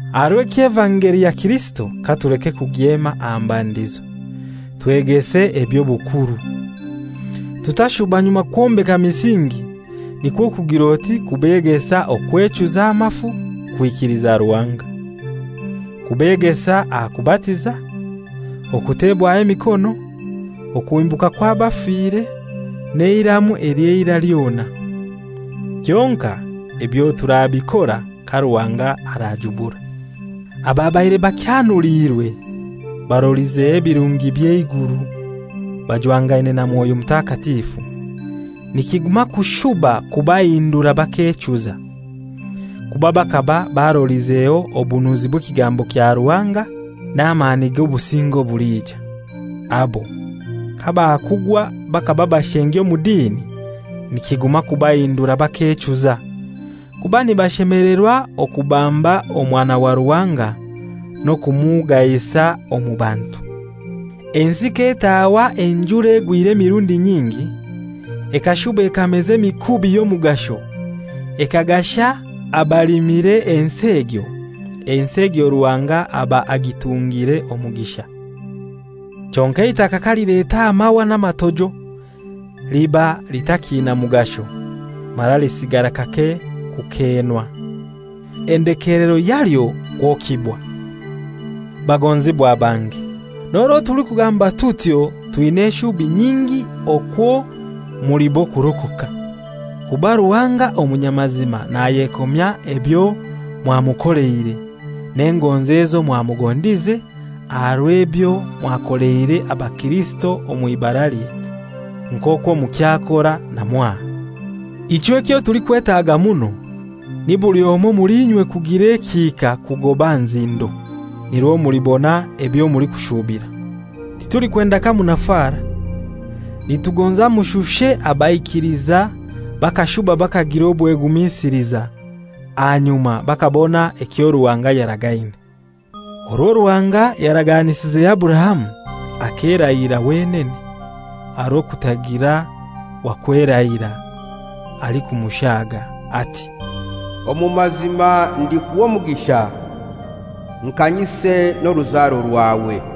Aha rw'ekyo evangeli ya Kirisito katuleke kugyema aha mbandizo, twegese eby'obukuru. Tutashuba nyuma kwombeka misingi, nikwo kugir'oti kubegesa okwechuza amafu kwikiliza Ruhanga; kubegesa aha kubatiza, okutebwaho emikono, okuhimbuka kw'abafire, n'eiramu ely'eira lyona. Kyonkai ebyo turabikora ka Ruhanga arajubura. Ababaire bakyanuliirwe, barolizeho ebirungi by'eiguru, bajwangaine na Mwoyo Mutakatifu, nikiguma kushuba kubahindura bakechuza kuba bakaba barolizeho obunuzi bw'ekigambo kya Ruhanga, n'amani g'obusinge obulija. Abo kabakugwa bakaba bashengi omu dini, nikiguma kubahindura bakechuza, kuba nibashemelerwa okubamba Omwana wa Ruhanga n'okumugahisa omu bantu. Ensi k'etaahwa enjura egwire emirundi nyingi, ekashuba ekameza emikubi y'omugasho ekagasha abalimire ensi egyo, ensi egyo Ruhanga aba agitungire omugisha. Kyonkai eitaka kalileta amahwa n'amatojo liba litakiina mugasho, mara lisigara kake kukeenwa. Endekelero yalyo kwokibwa. Bagonzibwa bange, n'orwo tulikugamba tutyo, twina eshubi nyingi okwo muli b'okurokoka. Kuba Ruhanga omunyamazima nayekomya ebyo mwamukoleire, n'engonzi ezo mwamugondize aha rw'ebyo mwakoleire abakirisito omw'ibaralye, nk'okwo mukyakora na mwaha. Ichwe ekyo tulikwetaga muno ni buli omoi omuli inywe kugira ekihika kugoba aha nzindo, nirwo mulibona ebyo mulikushubira. Titulikwenda kamunafara, nitugonza mushushe abaikiliza bakashuba bakagira obwegumisiliza, ahanyuma bakabona ekyo Ruhanga yaragaine. Orwo Ruhanga yaraganisize Aburahamu, akerahira wenene, aha rw'okutagira wa kwerahira alikumushaaga ati, «Omu mazima ndikuha omugisha nkanyise n'oruzaro rwawe.»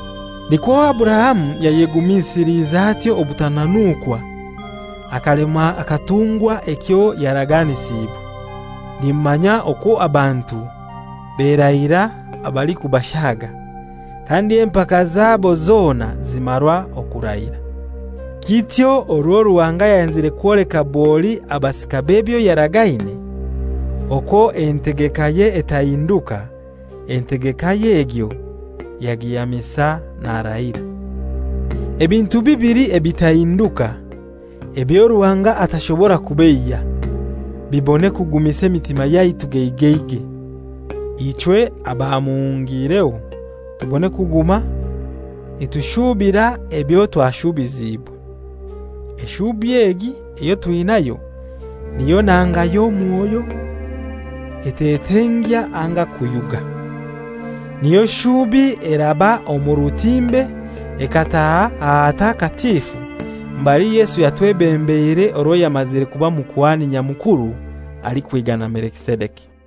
Nikwo Aburahamu yayegumisiliize atyo obutananukwa akalemwa akatungwa ekyo yaraganisiibwe. Nimumanya okwo abantu berahira abalikubashaaga, kandi empaka zabo zona zimarwa okurahira. Kityo orwo Ruhanga yayenzire kwoleka bwoli abasika b'ebyo yaragaine, okwo entegekaye etahinduka, entegekaye egyo yagihamisa narahira, ebintu bibili ebitahinduka, ebyo Ruhanga atashobora kubeiya, bibone kugumisa emitima yaitu geigeigei, ichwe abamuhungiireho tubone kuguma nitushubira ebyo twashubiziibwe. Eshubi egi eyo twinayo niyo nanga y'omwoyo etetengya anga kuyuga. Niyo shubi eraba omu rutimbe ekataaha ahatakatifu mbali Yesu yatwebembeire orwo yamazire kuba Mukuhani Nyamukuru alikwigana Melikisedeki.